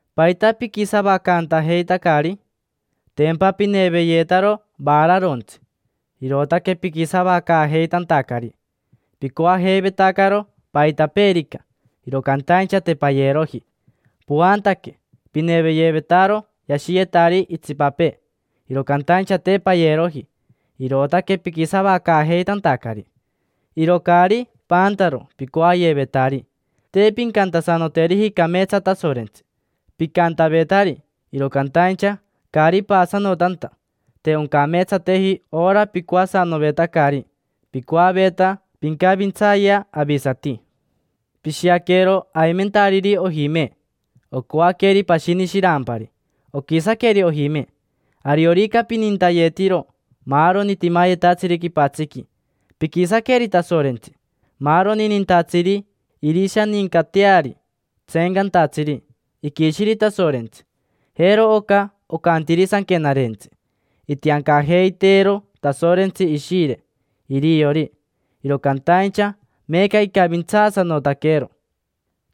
¿Paita piquisavacantajeitacari? Tempa pineveyetaro vaararontsi, irootaque piquisavacaajeitantacari. Picoajeivetacaro paitapeerica, iro cantaincha te payeroji. Poantaque. Pineveyevetaro yashiyetari itsipapee, iro cantaincha te payeroji, irootaque piquisavacaajeitantacari. Iro caari paantaro picoayevetari, te pincantasanoteriji cameetsa Tasorentsi. Picantavetari, iro cantaincha caari paasanotanta, te oncameetsateji ora picoasanovetacari: picoaveta pincavintsayea avisati. Pishiaquero aimentariri ojime: ocoaqueri pashini shirampari, oquisaqueri ojime. Ariorica pinintayetiro maaroni timayetatsiri quipatsiqui, piquisaqueri Tasorentsi. Maaroni nintatsiri irishanincateari tseencantatsiri iquishiri Tasorentsi. Jero oca ocantiri sanquenarentsi: “Itiancajeiteero Tasorentsi Ishire iriori, iro cantaincha meeca icavintsaasanotaquero: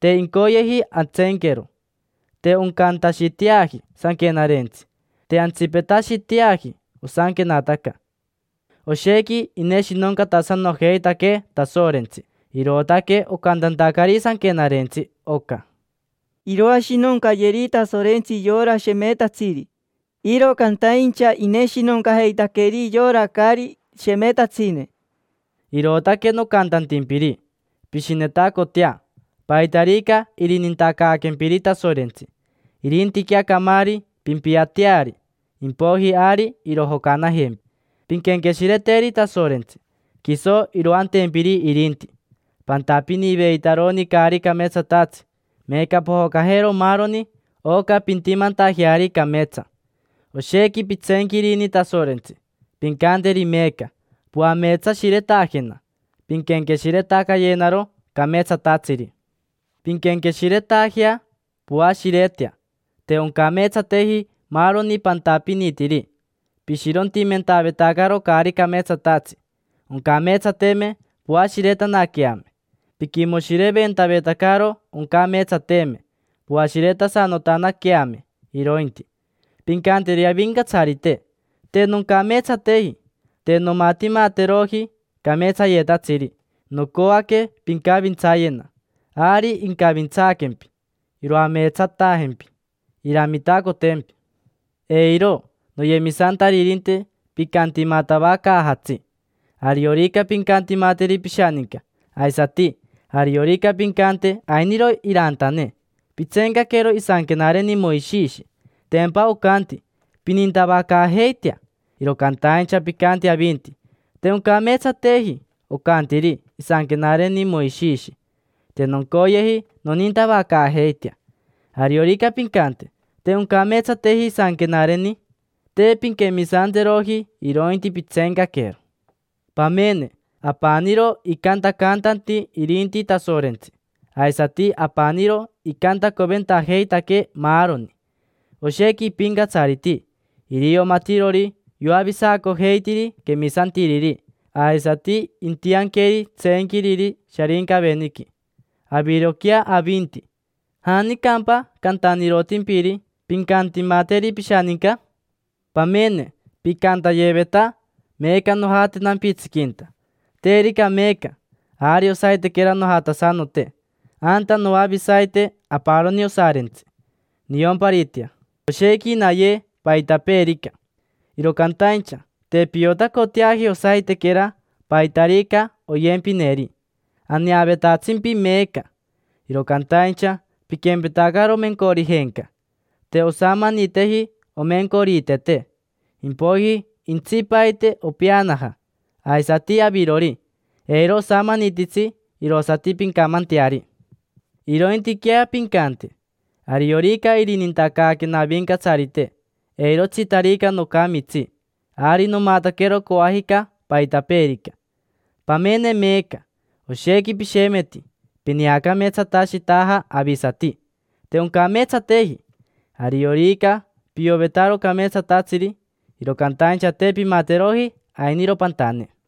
te incoyeji antseenquero”. Te oncantashiteaji sanquenarentsi, te antsipetashiteaji osanquenataca. Oshequi ineshinoncatasanojeitaquee Tasorentsi, irootaque ocantantacari sanquenarentsi oca: “Iroashinoncayeri Tasorentsi yora shemetatsiri, iro cantaincha ineshinoncajeitaqueri yora caari shemetatsine”. Irootaque nocantantimpiri: pishinetacotea, paitarica irinintacaaquempiri Tasorentsi. Irintiquea camaari, pimpiateari, impoiji ari irojocanajempi. Pinquenqueshireteri Tasorentsi, quiso iroantempiri irinti. Pantapiniveitaroni caari cameetsatatsi: meeca pojocajero maaroni oca pintimantajeari cameetsa. Oshequi pitseenquirini Tasorentsi; pincanteri meeca: “Poameetsashiretajena, pinquenqueshiretacayenaro cameetsatatsiri”. Pinquenqueshiretajea, poashiretea; te oncameetsateji maaroni pantapinitiri. Pishirontimentavetacaro caari cameetsatatsi: oncameetsateme poashiretanaqueame; piquimoshireventavetacaro: oncameetsateme poashiretasanotanaqueame, irointi. Pincanteri Avincatsarite: “Te noncameetsateji, te nomatimateroji cameetsayetatsiri. Nocoaque pincavintsayena”. Ari incavintsaaquempi, iroameetsatajempi, iramitacotempi. Eiro, noyemisantaririnte, picantimatavacaajatsi. Ariorica pincantimateri pishaninca, aisati ariorica pincante ainiro irantane, pitseencaquero isanquenareni Moishishi. Tempa ocanti: “Pinintavacaajeitea”. Iro cantaincha picanti avinti: “Te oncameetsateji ocantiri isanquenareni Moishishi. Te noncoyeji nonintavacaajeitea”. Ariorica pincante: “Te oncameetsateji isanquenareni”, te pinquemisanteroji, irointi pitseencaquero. Pamene, apaniro icantacantanti irinti Tasorentsi, aisati apaniro icantacoventajeitaquee maaroni. Oshequi ipincatsariti. Irio matirori yoavisacojeitiri quemisantiriri aisati intianqueri tseenquiriri Sharincaveniqui. Aviroquea, avinti, ¿janicampa cantanirotimpiri: “Pincantimateri pishaninca”? Pamene, picantayeveta: “Meeca nojate nampitsiquinta: terica meeca, ari osaitequera nojatasanote. Anta noavisaite aparoni osarintsi: niomparitea, oshequi naye paitapeerica”. Iro cantaincha te piotacoteaji osaitequera, paitarica oyempineri. Aneavetatsimpi meeca, iro cantaincha piquempetacaro mencorijenca. Te osamaniteji omencoriitete, impoiji jentsipaite opeanaja. Aisati avirori, eiro osamanititsi irosati pincamanteari. Irointiquea pincante: “Ariorica irinintacaaquena Avincatsarite, eirotsitarica nocamitsi, ari nomataquero coajica paitapeerica”. Pamene meeca, oshequi pishemeti, pineacameetsatashitaja avisati: te oncameetsateji. Ariorica piovetaro cameetsatatsiri, iro cantaincha te pimateroji, ainiro pantane.